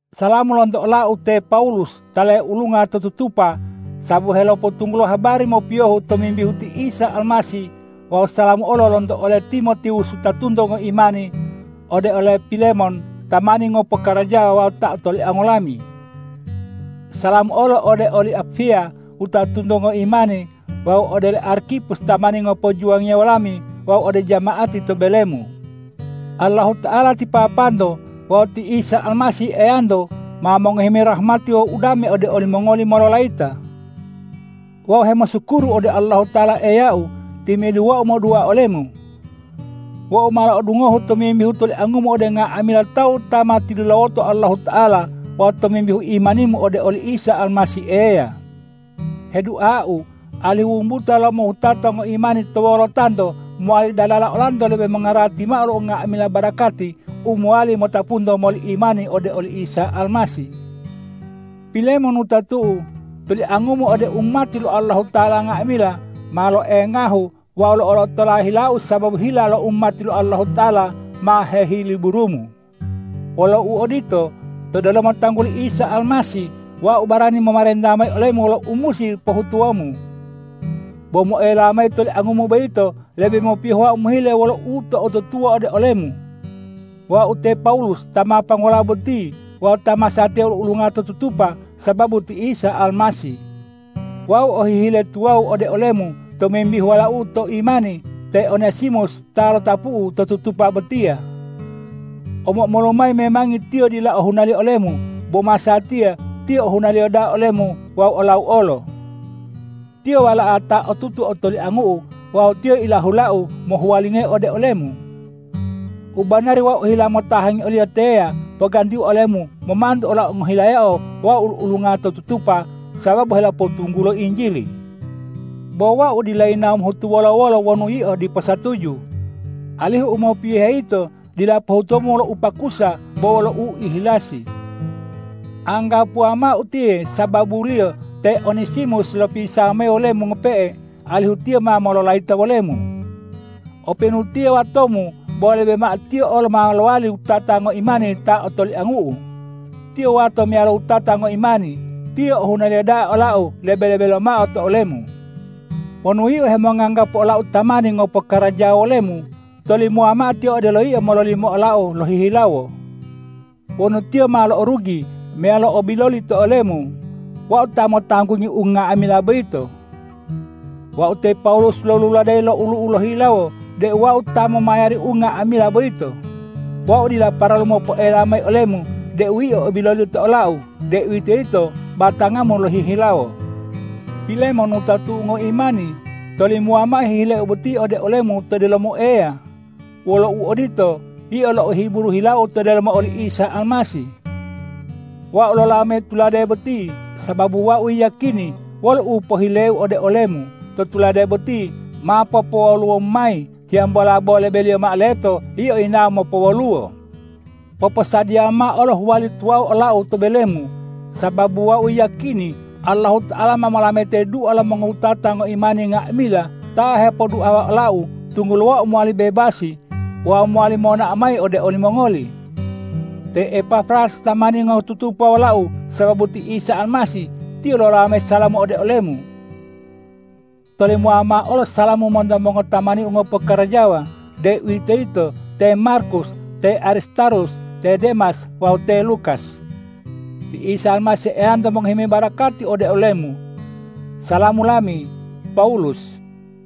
Salamu lonto olau te Pawulus ta leulunga to tutupa sababu helopotunggulo habari mopiyohu tomimbihu ti Isa Almasih wawu salamu olo lonto ole Timotiwus wutatunto ngoimani ode ole Pilemon tamani ngopokarajawa wawu ta otoliango lami. Salamu olo ode oli Apfiya wutatunto ngoimani wawu ode ole Arkipus tamani ngopojuwangiya wolami wawu ode jama'ati to belemu. Allahuta'ala ti Papanto wawu ti Isa Almasih Eyanto ma mongohi mayi rahmati wawu udame ode olimongoli mololayita. Wau hemosukuru ode Allahuta'ala Eyau timi'idu wau modua olemu. Wau ma lo'odungohu tomimbihu toliangumu ode nga'amila tawu ta ma tilulawoto Allahuta'ala wawu tomimbihu imanimu ode oli Isa Almasih Eya. Heduau alihu wumbuta lo umohutata ngoimani to wolotanto mowali dalala olanto lebe mongarati mao lo nga'amila barakati u mowali motapunto moli imani ode oli Isa Almasih. Pilemon wutatu'u, toliangumu ode umati lo Allahuta'ala nga'amila, ma loengahu wawu lo'olotola hilau sababu hila lo umati lo Allahuta'ala ma hehiliburumu. Wolo uodito, to delomo tangguli Isa Almasih wau barani momarenta mayi olemu wolo u musi pohutuwomu. Bo moela mayi toliangumu boyito, lebe mopiyohu wau mohile wolo uto'otutuwa ode olemu. Wau te Pawulus ta ma panggola boti wawu ta masatiya ulu-ulunga to tutupa sababu ti Isa Almasih. Wau o hihile tuwawu ode olemu tomimbihu walau'u to imani te Onesimus ta lotapu'u to tutupa botiya. Omo-omolu mayi memangi tiyo dila ohunaliyo olemu, bo masatiya tiyo ohunaliyo da'a olemu wawu olau olo. Tiyo wala'a ta otutu otoliangu'u wawu tiyo ilahulau mohuwalingayi ode olemu. U banari wau ohila motahangi oliyo teya pogantiu olemu momantu olau ngohilayao wau ulu-ulunga to tutupa sababu helopotunggulo Injili. Bo wau dila yinawo mohutu wolo-wolo wonu yio dipo satuju, alihu u mopiyohe yito dila pohutuwomu wolo upakusa bo wolo uihilasi. Anggapuwa mao utiye sababuliyo te Onesimus lopisawa mayi wolemu ngope'e, alihu tiyo ma mololayita wolemu. Openu tiyo watomu, bo lebe mao tiyo olo ma lowali wutata ngoimani ta otoliangu'u. Tiyo wato meyalo wutata ngoimani. Tiyo ohunaliyo da'a olau lebe-lebe lomao to olemu. Wonu yio hemonganggapu olau tamani ngopokarajawa wolemu, tolimowa mao tiyo odelo yio mololimo olau lohihilawo. Wonu tiyo ma lo'orugi meyalo o biloli to olemu, wau ta motanggungi unga'amila boyito. Wau te Pawulus loluladeyi lo olu'u lohihilawo deu wau ta momayari unga'amila boyito. Wau dila paralu mopoela mayi olemu deu yio o biloli to olau, deuwitoyito batangamu lohihilawo. Pilemon wutatu'u ngoimani, tolimowa mao hihileu boti ode olemu to delomo Eya. Wolo uodito, yio lo'ohiburu hilau to delomo oli Isa Almasih. Wau lolawo mayi tulade boti, sababu wau yiyakini wolo u pohileu ode olemu to tulade boti ma popowoluwomu mayi, hiyambola bo lebeliyo mao leto yio yinawo mopowoluwo. Poposadiyawa mao olo huwali tuwawu olau to belemu, sababu wau yiyakini Allahuta'ala ma molametayi dua lo mongowutata ngoimani nga'amila ta hepoduawa olau, tunggulo wau mowali bebasi wawu mowali monao mayi ode olimongoli. Te Epafras tamani ngotutupa wolau sababu ti Isa Almasih, tiyo lolawo mayi salamu ode olemu. Tolimowa mao olo salamu monto mongotamaniu ngopokarajawa, deuwitoyito te Markus, te Aristarhus, te Demas wawu te Lukas. Ti Isa Almasih Eyanto mongohi mayi barakati ode olemu. Salamu lami, Pawulus